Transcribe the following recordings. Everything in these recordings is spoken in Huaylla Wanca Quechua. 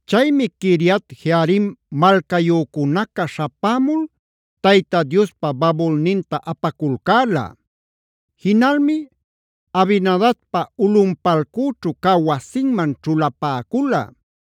Chaymi Quiriat-jearim malcayücunaca śhapämul Tayta Diospa babulninta apaculcäla. Jinalmi Abinadabpa ulꞌunpalcüćhu cä wasinman ćhulapäcula.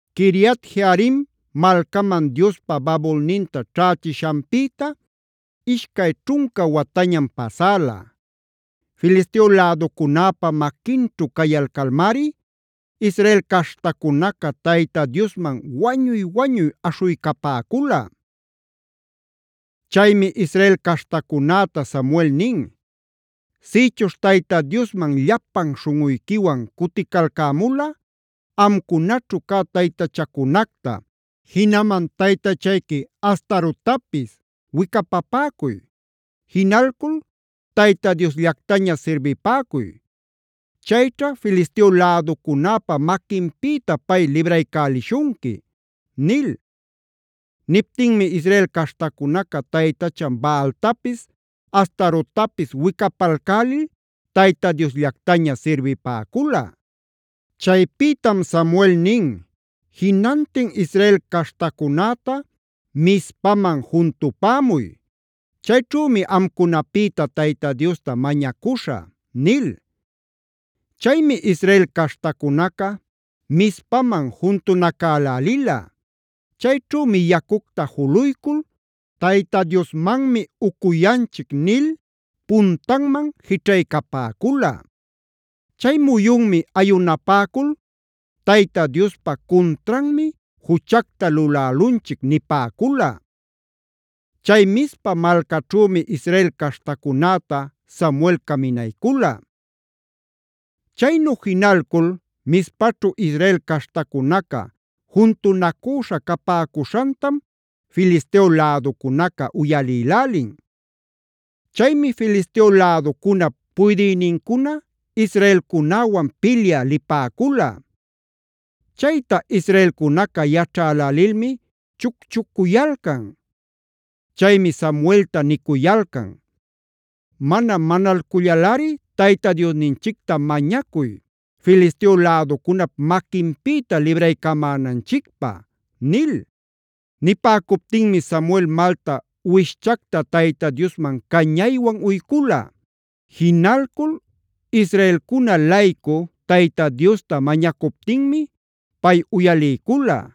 Quiriat-jearim malcaman Diospa babulninta ćhächishanpïta ishcay ćhunca watañam pasäla. Filisteo läducunäpa maquinćhu cayalcalmari Israel caśhtacunaca Tayta Diosman wañuy-wañuy aśhuycapäcula. Chaymi Israel caśhtacunäta Samuel nin: “Sïchuśh Tayta Diosman llapan śhunꞌuyquiwan cuticalcämulꞌa amcunaćhu cä taytachacunacta, jinaman taytachayqui Astarottapis wicapapäcuy. Jinalcul Tayta Diosllactaña sirbipäcuy; chayćha Filisteo läducunäpa maquinpïta pay libraycälishunqui” nil. Niptinmi Israel caśhtacunaca taytachan Baaltapis, Astarottapis wicapalcälil Tayta Diosllactaña sirbipäcula. Chaypïtam Samuel nin: “Jinantin Israel caśhtacunäta Mizpaman juntupämuy. Chayćhümi amcunapïta Tayta Diosta mañacuśhä” nil. Chaymi Israel caśhtacunaca Mizpaman juntunacälälila. Chayćhümi yacucta juluycul “Tayta Diosmanmi ucuyanchic” nil puntanman jićhaycapäcula. Chay muyunmi ayunapäcul: “Tayta Diospa cuntranmi juchacta lulälunchic” nipäcula. Chay Mizpa malcaćhümi Israel caśhtacunäta Samuel caminaycula. Chaynu jinalcul Mizpachu Israel caśhtacunaca juntunacüśha capäcuśhantam Filisteo läducunaca uyalïlälin. Chaymi Filisteo läducunap puydïnincuna israelcunäwan pilyä lipäcula. Chayta israelcunaca yaćhälälilmi chucchucuyalcan. Chaymi Samuelta nicuyalcan: “Mana manalcullalꞌari Tayta Diosninchicta mañacuy Filisteo läducunap maquinpïta libraycamänanchicpä” nil. Nipäcuptinmi Samuel malta uwishchacta Tayta Diosman cañaywan uycula. Jinalcul israelcuna-laycu Tayta Diosta mañacuptinmi pay uyaliycula.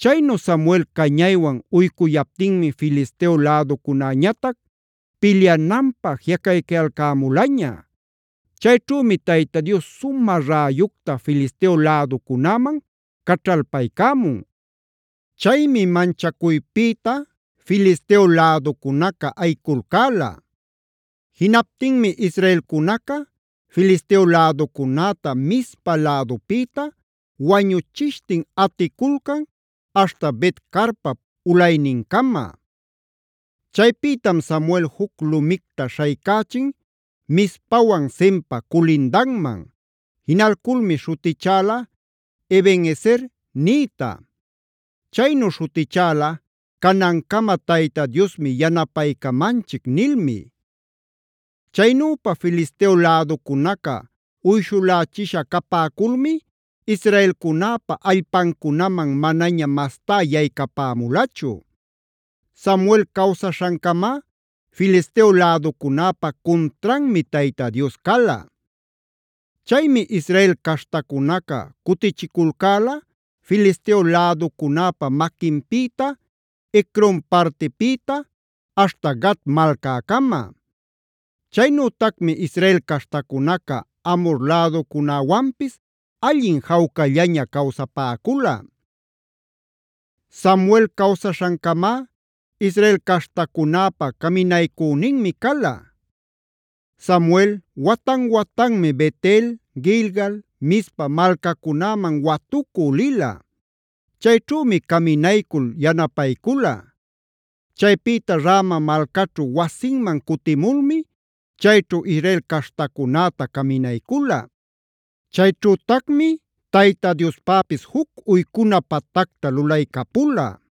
Chaynu Samuel cañaywan uycuyaptinmi Filisteo läducunäñatac pilyananpä jiꞌacaycayalcämulaña. Chayćhümi Tayta Dios sumä räyucta Filisteo läducunäman caćhalpaycämun. Chaymi manchacuypïta Filisteo läducunaca ayiculcäla. Jinaptinmi israelcunaca Filisteo läducunäta Mizpa lädupïta wañuchishtin aticulcan aśhta Bet-carpap ulaynincama. Chaypïtam Samuel juc lumicta śhaycächin Mizpawan Senpa culindanman. Jinalculmi śhutichäla “Eben-ezer”b nïta. Chaynu śhutichäla: “Canancama Tayta Diosmi yanapaycamanchic” nilmi. Chaynüpa Filisteo läducunaca uyshulächisha capäculmi israelcunäpa allpancunaman manaña mastá yaycapämulachu. Samuel cawsaśhancamá Filisteo läducunäpa cuntranmi Tayta Dios cala. Chaymi Israel caśhtacunaca cutichiculcäla Filisteo läducunäpa maquinpïta Ecron partipïta aśhta Gat malcäcama. Chaynütacmi Israel caśhtacunaca Amhor läducunäwanpis allin jawcallaña cawsapäcula. Samuel cawsaśhancamá Israel caśhtacunäpa caminaycüninmi cala. Samuel watan-watanmi Bet-el, Gilgal, Mizpa malcacunäman watucü lila. Chayćhümi caminaycul yanapaycula. Chaypïta Rama malcaćhu wasinman cutimulmi chayćhu Israel caśhtacunäta caminaycula. Chayćhütacmi Tayta Diospäpis juc uycuna patacta lulaycapula.